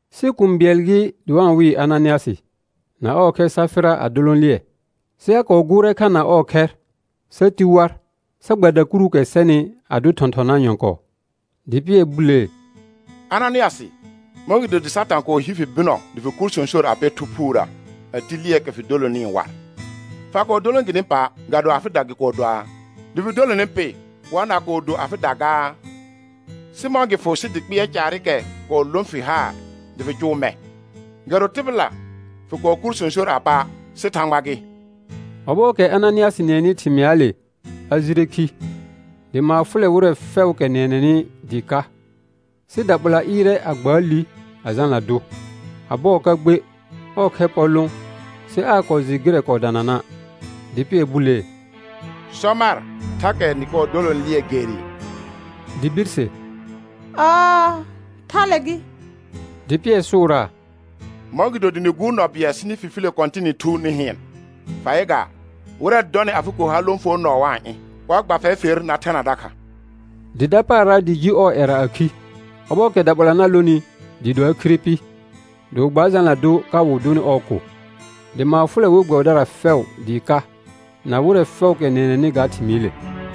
Sɩ kũu bɩɛl gɩ dɩ wa-n wɩɩ Ananɩasɩ, na ɔɔ khɛr Safɩra a dolõ lɩɛ. Sɩ a kɔɔ gʋʋrɛ kha na ɔɔ khɛr sa ti war sa gba dakuruukɛ sɛnɩ a dʋ thɔ̃thɔnaa nyɔ̃kɔɔ. Dɩ Pɩɛr bulee: Ananɩasɩ, mɔ̃gɩdo dɩ Satã kɔɔ hi fi bɩnɔ dɩ fɩ kur sõsor a pɛ Thu Phuurə a ti lɩɛɛkɛ fɩ dolonɩɩ war? Fa kɔɔ dolõ gɩnɩ pa', ga do afɩda gɩ kɔɔ doaa? Dɩ fɩ dolonɩ pɩ, war na kɔɔ do afɩda gaa? Sɩ mɔ̃ gɩ fʋ sɩ dɩ kpɩɛr caarɩkɛ kɔɔ lõ fɩ haar dɩ fɩ cʋʋ mɛ̃? Ga do tɩbɩla fɩ kɔɔ kur sõsor a pa', sɩ Thãgba gɩ. Ɔbɔɔkɛ Ananɩasɩ nɩɛnɩ thɩmɩaale a jire khi. Dɩ maar fʋlɛ wɩrɛ fɛʋʋkɛ nɩɛnɛnɩ dɩɩ ka. Sɩ daɓola ɩɩrɛ a gbaa li a jalna dʋ. A bɔɔ ka gbe, ɔɔ khɛr pɔr lõ sɩ aa kɔɔ jɩ gɩrɛ kɔɔ danana', dɩ Pɩɛr bulee: Sɔ mar, thakɛ nɩ kɔɔ dolõ lɩɛ gerɩɩ? Dɩ birse: Ɔɔ, thale gɩ. Dɩ Pɩɛr sʋʋraa: Mɔ̃gɩdo dɩ nɩ gʋʋr nɔ bɩɛl sɩ nɩ fifilə Kɔ̃tɩnɩ Thu nɩ hɩɩn? Fa yɩ gaa, wɩrɛ dɔnɩ afɩ ko har lõfonɔɔ wa-n ɩ̃, wa gba fɛr fer, na thena dakha. Dɩ dapaara dɩ ji ɔɔ ƴɛra a khi; ɔbɔɔkɛ daɓola na lonɩ dɩɩ do a khire pɩ, dɩ wɩ gbaa jalna dʋ ka wɩ dʋnɩ ɔɔ ko. Dɩ maar fʋlɛ we gbɛbɩdara fɛʋ dɩɩ ka na wɩrɛ fɛʋʋkɛ nɩɛnɛnɩ ga thɩmɩɩle.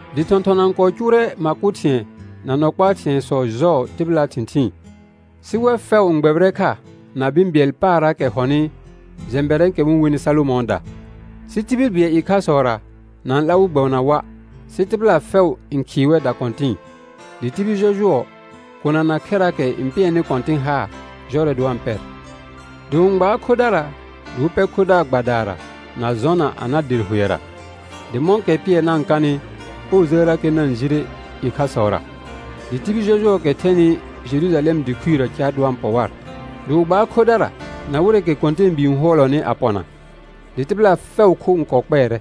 Dɩ thɔ̃thɔna n kɔɔ cʋʋrɛ ma kʋ thɩ̃ɛ na nɔ kpaa thɩ̃ɛsɔ jɔɔ tɩbɩlaa thɩ̃thɩɩn, sɩ wɛr fɛʋ n gbɛbɩrɛ kha na bɩ̃ bɩɛl paarraakɛ hɔnɩ jɛ̃bɛrɛ̃ɛkɛ wɩ-n wenɩ Salomɔ̃ɔda. Sɩ tibil bɩɛl ɩkhasɔra na-n 'la wɩ gbɛbɩna wa', sɩ tɩbɩla fɛʋ n khɩɩ wɛr dakɔ̃tɩ̃ɩ. Dɩ tibil jɔjʋɔ, kona na khɛraakɛ n pɩɛrnɩ Kɔ̃tɩn haar jɔrɛ dɩ wa-n pɛr. Dɩ wɩ-n gbaar khodara dɩ wɩ pɛ khodaar gbadaara na jɔna a na der hʋɛra, dɩ mɔ̃kɛ Pɩɛr na-n kanɩ ɔɔ jəərrakɛ na-n jire ɩkhasɔra. Dɩ tibil jɔjʋɔɔkɛ thɛnɩ Jerujalɛm dɩ khuirə car dɩ wa-n pɔ war; dɩ wɩ gbaar khodara na wɩrɛɛkɛ kɔ̃tɛɛbii n hʋɔlɔnɩ a pɔna, dɩ tɩbɩla fɛʋʋ kho n kɔɔ kpɛɛrɛ.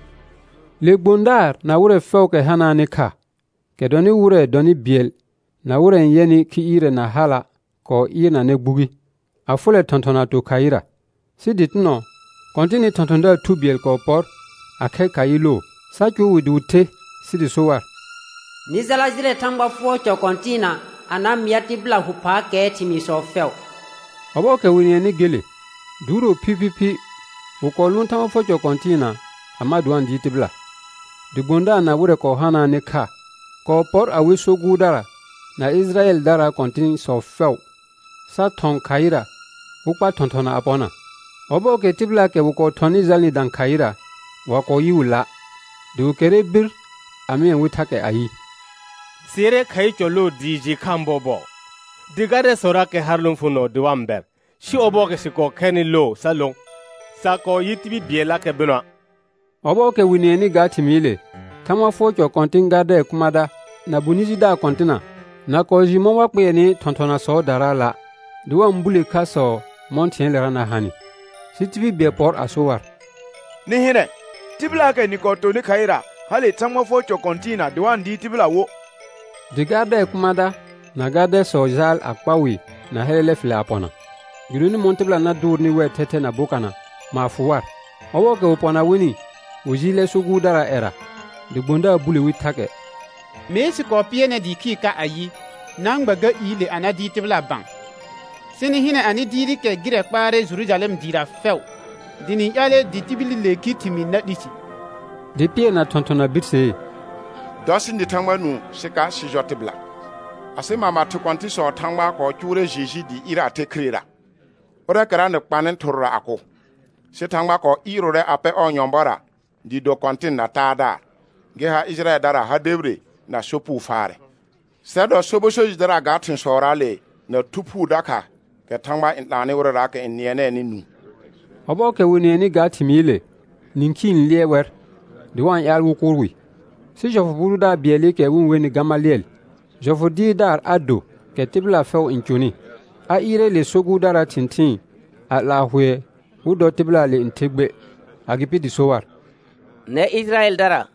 Le gbõdaar na wɩrɛ fɛʋʋkɛ hanaanɩ kha, kɛ dɔnɩ wɩrɛ dɔnɩ bɩɛl na wɩrɛ n yɛnɩ khi ɩɩrɛ na hala' kɔɔ ɩɩrnanɛ gbugi, a fʋlɛ thɔ̃thɔna a to khaɩra. Sɩ dɩtɩnɔ Kɔ̃tɩnɩ thɔ̃thɔ̃daar thu bɩɛl kɔɔ pɔr a khɛr khaɩ loo, sa cʋʋ wɩ dɩ wɩ the sɩ dɩ so war: Nɩ jala jɩlɛ Thãgba fʋɔr cɔ kɔ̃tɩɩna a na mɩa tɩbɩla hʋ phaakɛɛ thɩmɩɩsɔ fɛʋ. Ɔbɔɔkɛ wɩ nɩɛnɩ gele, duuro phiphiphi wɩ kɔɔ lʋʋn Thãgba fʋɔr cɔ kɔ̃tɩɩna a ma dɩ wa-n dɩɩr tɩbɩla. Dɩ gbõdaar na wɩrɛ kɔɔ hanaanɩ kha kɔɔ pɔr a we so gʋʋrdara na Ɩjɩrayɛldaraa kɔ̃tɩ̃sɔ fɛʋ, sa thɔ̃ khaɩra wɩ kpa thɔ̃thɔna a pɔna. Ɔbɔɔkɛ tɩbɩlaakɛ wɩ kɔɔ thɔnɩ jalnɩ dã khaɩra, wa kɔɔ yɩ wɩ la'. Dɩ wɩ kɛrrɛ bir a mɩɛ wɩ thakɛ ayɩ: Sɩ yɩrɛ khaɩ cɔ loo dɩɩ jɩɩ khaan bɔɔbɔɔ, dɩ gardɛsɔrakɛ har lõfonɔɔ dɩ wa-n bɛr, sɩ ɔbɔɔkɛ sɩ kɔɔ khɛrnɩ loo sa lõ, sa kɔɔ yɩ tibil bɩɛllakɛ bɩnɔa'. Ɔbɔɔkɛ wɩ nɩɛnɩ ga thɩmɩɩle, Thãgba fʋɔr cɔ kɔ̃tɩ̃ gardɛɛ kʋmãda na bonɩ jidaar kɔ̃tɩna na kɔɔ jɩ mɔ̃ wa kpɩɛrnɩ thɔ̃thɔnasɔɔdaraala', dɩ wa-n bule khasɔ mɔ̃ thɩ̃ɛɛlera na hanɩ. Sɩ tibil bɩɛl pɔr a so war: Nɩ hɩnɛ, tɩbɩlaakɛ nɩ kɔɔ tonɩ khaɩra hale Thãgba fʋɔr cɔ kɔ̃tɩɩna dɩ wa-n dɩɩr tɩbɩla wo. Dɩ gardɛɛ kʋmãda na gardɛsɔ jaal a kpa wɩ na hɛlɛlɛ fɩlɛ a pɔna, gɩdonɩ mɔ̃ tɩbɩla na dʋʋrnɩ wɛr thɛthɛ na bokana, maar fʋ war. Ɔbɔɔkɛ wɩ pɔna wɩnɩ, wɩ jɩɩlɛ so gʋʋrdaraa ƴɛra. Dɩ gbõdaar bule wi thakɛ: Mee sɩ kɔɔ pɩɛr nɛr dɩɩ khɩɩr ka ayɩ: Na-n gba ga iile a na dɩɩr tɩbɩla bã; sɩ nɩ hɩnɛ anɩ dɩɩrɩkɛ gɩrɛ kpaarɛ Jerujalɛm dɩɩra fɛʋ, dɩ nɩ-n ƴaalɛ dɩ tibililee khi thɩmɩɩ na 'li si. Dɩ Pɩɛr na thɔ̃thɔna birsee: Dɔ sɩ nɩ Thãgba nũu sɩ ka sɩ jɔ tɩbɩla. Asɩ mama thɩ kɔ̃tɩ̃sɔɔ Thãgba kɔɔ cʋʋrɛ Jeju dɩ ɩɩr a the khirera, ʋrɛɛkɛra nɩ kpanɩ thɩrʋra a kʋ; sɩ Thãgba kɔɔ ɩɩrʋʋrɛ a pɛ ɔɔ nyɔ̃bɔra dɩ do Kɔ̃tɩn na Taadaar, gɩ ha Ɩjɩrayɛldara ha debire na sopugo faarɛ. Sɛr dɔ sobɔ so jɩdara ga thɩ̃sɔraale na Thu Phuu dakha kɛ Thãgba n 'laanɩ wɩrɛraakɛ n nɩɛnɛɛnɩ nũu. Ɔbɔɔkɛ wɩ nɩɛnɩ ga thɩmɩɩle nĩkhii n lɩɛr wɛr dɩ wa-n ƴaal wɩ kʋʋr wɩ. Sɩ jɔfʋ bʋ dʋdaar bɩɛlɩkɛ wɩ-n wenɩ Gamalɩɛl, jɔfʋ dɩɩrdaar a do kɛ tɩbɩla fɛʋ n cʋnɩ, a ɩɩrɛ le so gʋʋrdaraa thɩ̃thɩɩn a 'laa hʋɛ wɩ dɔ tɩbɩlaale n the gbe. Agɩpɩ dɩ so war: Nɛr Ɩjɩrayɛldara,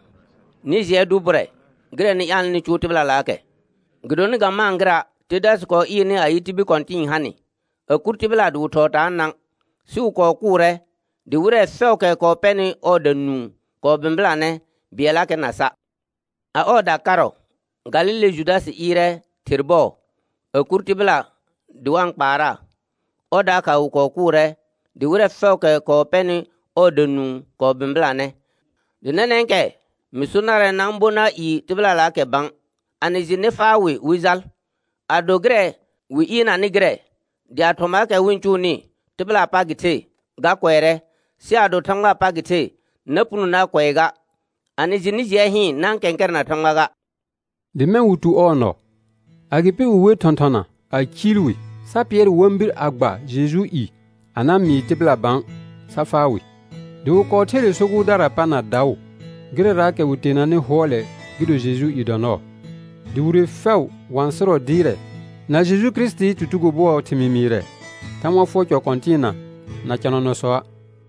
nɩ jɩɛ dʋ bʋrɛ gɩrɛ nɩ ƴaalnɩ nɩ cʋʋ tɩbɩlalaakɛ. Gɩdonɩ ga maan gɩra', Tədasɩ kɔɔ ɩɩrnɩ ayɩ, tibil kɔ̃tɩ̃ɩ ha nɩ; a kʋr tɩbɩla dɩ wɩ thɔɔ taanã. Sɩ wɩ kɔɔ kʋʋrɛ dɩ wɩrɛ fɛʋʋkɛ kɔɔ pɛnɩ ɔɔda nũu kɔɔ bɩ̃bɩlanɛ, bɩɛllakɛ na sa'. A ɔɔda karɔ, Galile Judasɩ ɩɩrɛ ther bɔɔ a kʋr tɩbɩla dɩ wa-n kpaaraa; ɔr dakha wɩ kɔɔ kʋʋrɛ, dɩ wɩrɛ fɛʋʋkɛ kɔɔ pɛnɩ ɔɔda nũu kɔɔ bɩ̃bɩlanɛ. Dɩ nɛnɛ̃kɛ mɩ so narɛ, na-n bo na ɩɩ tɩbɩlalaakɛ bã; a nɩ jɩ, nɩ faa wɩ wɩ jal. Ado gɩrɛ wɩ ɩɩrnanɩ gɩrɛ, dɩ a thɔmaakɛ wɩ-n cʋʋnɩ, tɩbɩlaa pa gɩ the, ga kʋɛrɛ. Sɩ ado Thãgbaa pa gɩ the, na puno na kʋɛ ga. A nɩ jɩ, nɩ jɩɛ hɩɩn na-n kɛ̃kɛrɛna Thãgba ga. Dɩ mɛ̃ wɩ tu ɔɔ nɔ. Agɩpɩ wɩ wer thɔ̃thɔna a ciil wi, sa pɩɛr wɩ wa-n bir a gba Jejuu i a na mɩɩ tɩbɩla bã, sa faa wɩ. Dɩ wɩ kɔɔ ther le so gʋʋrdaraa pa na daʋ gɩrɛraakɛ wɩ teenanɩ hʋɔlɛ gɩ do Jejuu i dɔ nɔɔ. Dɩ wire fɛʋ wa-n sɩrɔ dɩɩrɛ, na Jeju Kirisitii tutugo bʋɔɔ thɩmɩɩ mɩɩrɛ Thãgba fʋɔr cɔ kɔ̃tɩɩna na cɔnanɔsɔa'.